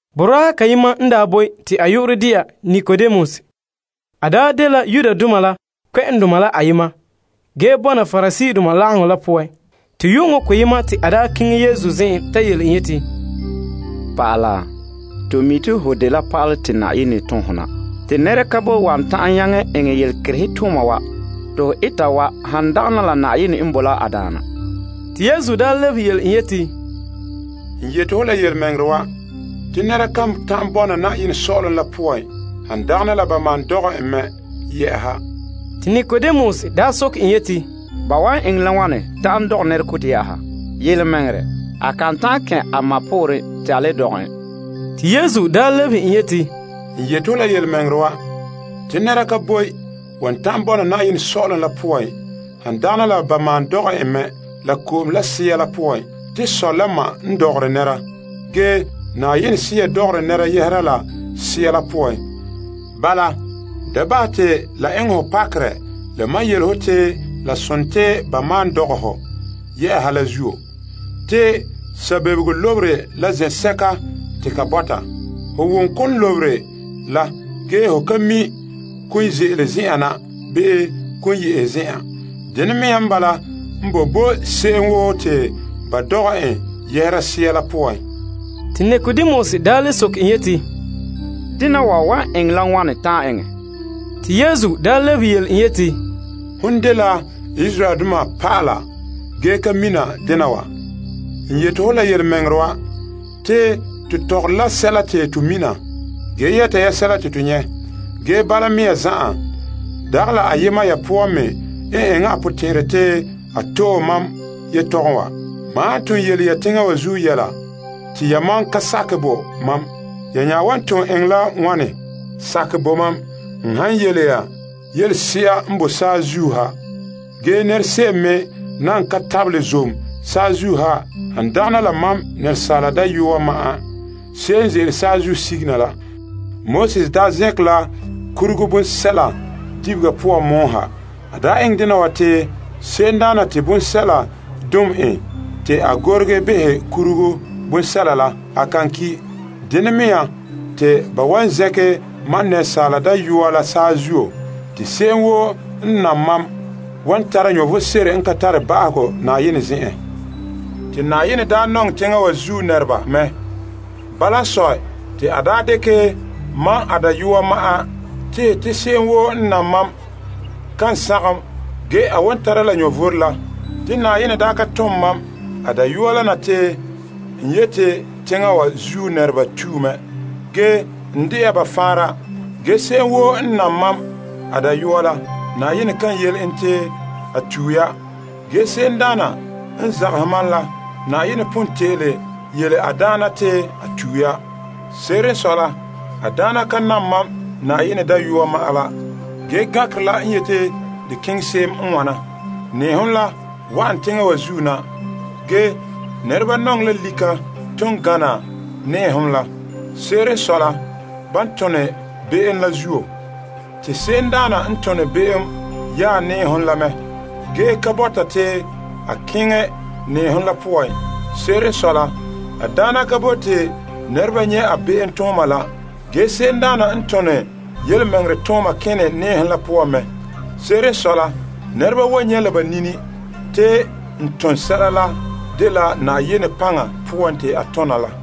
Boraa kayema n daa boe te a yu'urɛ dɛna Nikodemus. A dela Yudoma la kpɛ'ɛndoma la ayema, ge bɔna Pariseedoma lagaŋɔ la poan. Te yu'uŋɔ koyena te a keŋɛ Yesu zen'en ta yele en yeti, Naa, to mi' te ho dela pa'ala te Na'ayenɛ tom hɔ na. Te nɛra ka boe wan ta'an eŋɛ yelekerehe tooma wa te ho eta wa, han dagana la Na'ayenɛ n bo la a daana. Yesu lebehe yele en yeti, N yeti ho la yelemɛŋɛrɛ wa, te nɛra kan ta'an bɔna Na'ayenɛ sɔ'ɔlom la poan, han dagana la ba maan dɔgɛ en. Nikodemus soke en yeti, Ba wan eŋɛ la wane ta'an dɔgɛ nɛrekotɛ? Yelemɛŋɛrɛ, a kan ta'an kɛn' a ma pooren te a le dɔgɛ en. Yesu lebehe en yeti, N yeti ho la yelemɛŋɛrɛ wa, te nɛra ka boe wan ta'an bɔna Na'ayenɛ sɔ'ɔlom la poan, han dagana la ba dɔgɛ en mɛ la ko'om la Sea la poan. Asaala n dɔgɔre nɛra, ge Yenɛ Sea n dɔgɔre nɛra Sea poan. Bala, da bahɛ te la eŋɛ hɔ pakerɛ la mam yele ho te la sontii ba malom dɔgɛ ho yɛ'ɛha la zuo. Te sabebego lobere la zen'sɛka te ka bɔta. Ho wom kon lobere la, ge ho ka mi' kon ze'ele zen'an na, bii kon ye' zen'an. Dene mea n bala n boe bo se'em woo te ba dɔgɛ en yɛhera Sea la poan. Te Nikodemus le soke en yeti, Dena wa wan eŋɛ la wane ta'an eŋɛ? Te Yesu lebehe yele en yeti, Hon dela Israeldoma pa'ala ge ka mina dena wa? N yeti ho la yelemɛŋɛrɛ wa, te to tɔgɔre la sɛla te to mina ge yɛta ya sɛla te to nyɛ'. Ge bala mea zan'an, dagɛ la ayema ya poan me n eŋɛ a potɛn'ɛrɛ te a to'e tomam yetɔgɔm wa. Mam han ton yele ya teŋa wa zuo yɛla te yamam ka sakɛ bo mam, ya wan ton eŋɛ la wane sakɛ bo mam n han yele ya yelese'a n boe saazuo ha, ge nɛrese'em me nan ka tabelɛ zom saazuo ha, han dagana la Asaala Dayɔa ma'an, se'em n ze'ele saazuo sige na. Moses daa zɛnkɛ la nyɔgom bonsɛla dibega zuo pɔgɔtia poan ha. A enŋ dena wa te se'emdaana te bonsɛla dom en te a gorege behɛ nyɔgom bonsɛla la, a kan ki'. Dene mea, te ba wan zɛnkɛ Asaala Dayɔa la saazuo. Te se'em woo n nam mam wan tara vom sebo n ka tare ba'ahegɔ Na'ayenɛ zen'en. Te Na'ayenɛ daa nɔŋɛ teŋa wa zuo nɛreba mɛ. Bala n sɔe, te a dekɛ mam a dayɔa ma'an tehɛ te se'em woo n nam mam, kan sagom, ge a wan tara la vom n ka tare ba'ahegɔ. Te Na'ayenɛ ka tom mam a Dayɔa la na te n yeti teŋa wa zuo nɛreba tue mɛ, ge n dɛna ba faanra. Ge se'em woo n nam mam a Dayɔa la, Na'ayenɛ kan yele en te a tue ya. Ge se'emdaana n zagahɛ mam la, Na'ayenɛ pon te'ele yele a daana te a tue ya. Se'ere n sɔe la, a daana ka nam mam Na'ayenɛ Dayɔa ma'an la. Ge gankerɛ la n yeti de keŋɛ se'em n wana, nɛɛhom la wa'an teŋa wa zuo na, ge nɛreba nɔŋɛ la lika la ton gana nɛɛhom la. Se'ere n sɔe la, ban tone be'em la zuo. Te se'emdaana n tone be'em yaɛ nɛɛhom la mɛ, ge ka bɔta te a keŋɛ nɛɛhom la poan. Se'ere n sɔe la, a daana ka bote nɛreba nyɛ' a be'emtooma la. Ge, se'emdaana n tone yelemɛŋɛrɛ tooma kene nɛɛhom la poan. Se'ere n sɔe la, nɛreba wan nyɛ' la ba nini te n ton sɛla la dela Na'ayenɛ paŋa poan te a tona la.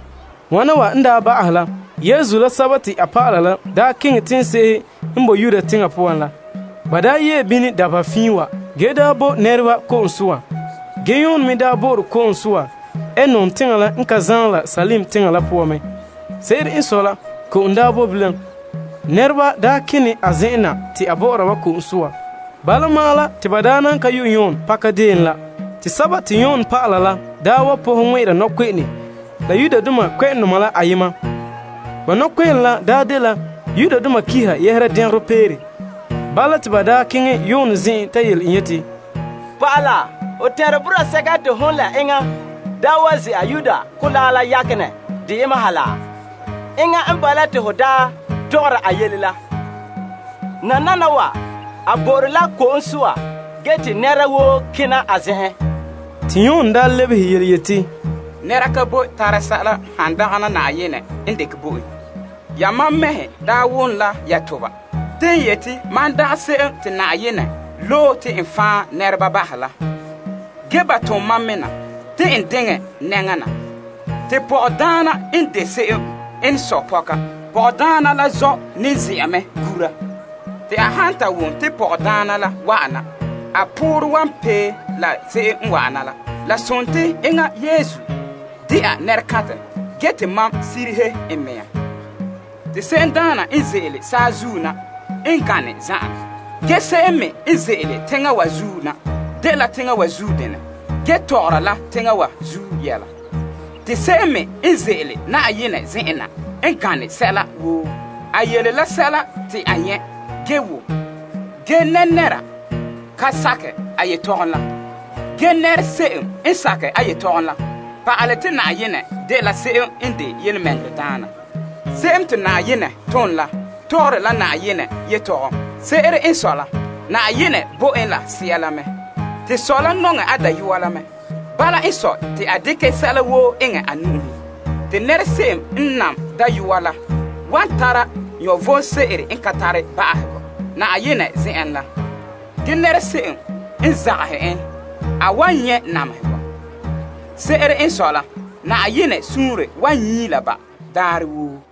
Wana wa n ba'ahɛ la, Yesu la a dɔlɔba la keŋɛ la teŋse'ehe n boe Yuda teŋa poan la. Ba yee bini dabeha fiin wa, ge bo nɛreba ko'om soa. Ge Yon me bo'ore ko'om soa Aenon teŋa la n ka zaan la Salim teŋa poan. Se'ere n sɔe la, ko'om boe bilam. Nɛreba kene a zen'en na te a bɔ'ɔra ba ko'om soa. Bala ma'an la, te ba nan ka yo' Yon pakadeen la. Te Yon dɔlɔba la wa pɔhɛ ŋmɛ'ɛra nɔkpe'eŋe la Yudoma la ayema. Ba nɔkpe'ene la dela malema soa yɛla. Bala, te ba keŋɛ Yon zen'en ta yele en yeti, Naa, ho tɛn'ɛre boraa sɛka te hon la enŋa daa wa ze'a Yordan Kolaa la yakenɛ deyema ha la? Enŋa n bala te ho tɔgɔra a yele la. Nananawa, a bo'ore la ko'om soa ge te nɛra woo kena a zen'en. Te Yon lebehe yeti, Nɛra ka boe tara sɛla han dagana la Yenɛ n dekɛ bo en. Yamam mɛhe wom la ya toba te n yeti mam dagɛ se'em te Yenɛ loe la. Ge, ba tom mam me na te n diŋɛ a nɛŋa na. Te pɔgɔdaana n de se'em n sɔe pɔga. Pɔgɔdaana la zɔ' la ne ze'a mɛ gura. Te a han ta wom pɔgɔdaana la wa'ana, a poorɛ wan pee la se'em n wa'ana la. La sontii enŋa Yesu de'a nɛrekantɛ ge te mam sirihe n mea. Te se'emdaana n ze'ele saazuo na n gane zan'an. Ge se'em me n ze'ele teŋa wa zuo na, dela teŋa wa zuo denɛ ge tɔgɔra la teŋa wa zuo yɛla. Te se'em me n ze'ele Yenɛ zen'en na n gane sɛla woo. A yele la sɛla te a nyɛ' ge wom. Ge nɛra ka sakɛ a yetɔgɔm la. Ge nɛrese'em n sakɛ a yetɔgɔm la pa'alɛ te Yenɛ dela se'em n de yelemɛŋɛrɛdaana. Se'em te Yenɛ tom la tɔgɔre la Yenɛ yelehom. Se'ere n sɔe la, Yenɛ bo en a Sea la n ka tare makerɛ. Te Sɔ la nɔŋɛ a Dayɔa la mɛ. Bala n sɔe, te a dekɛ sɛla woo eŋɛ a nu'uhen. Te nɛrese'em n nam Dayɔa la wan tare vom sebo n ka tare ba'ahegɔ Na'ayenɛ zen'en la. Ge nɛrese'em n zagahɛ kan nyɛ' vom. Se'ere n sɔe la, Yenɛ suunre wan nyii la ba daarɛ woo.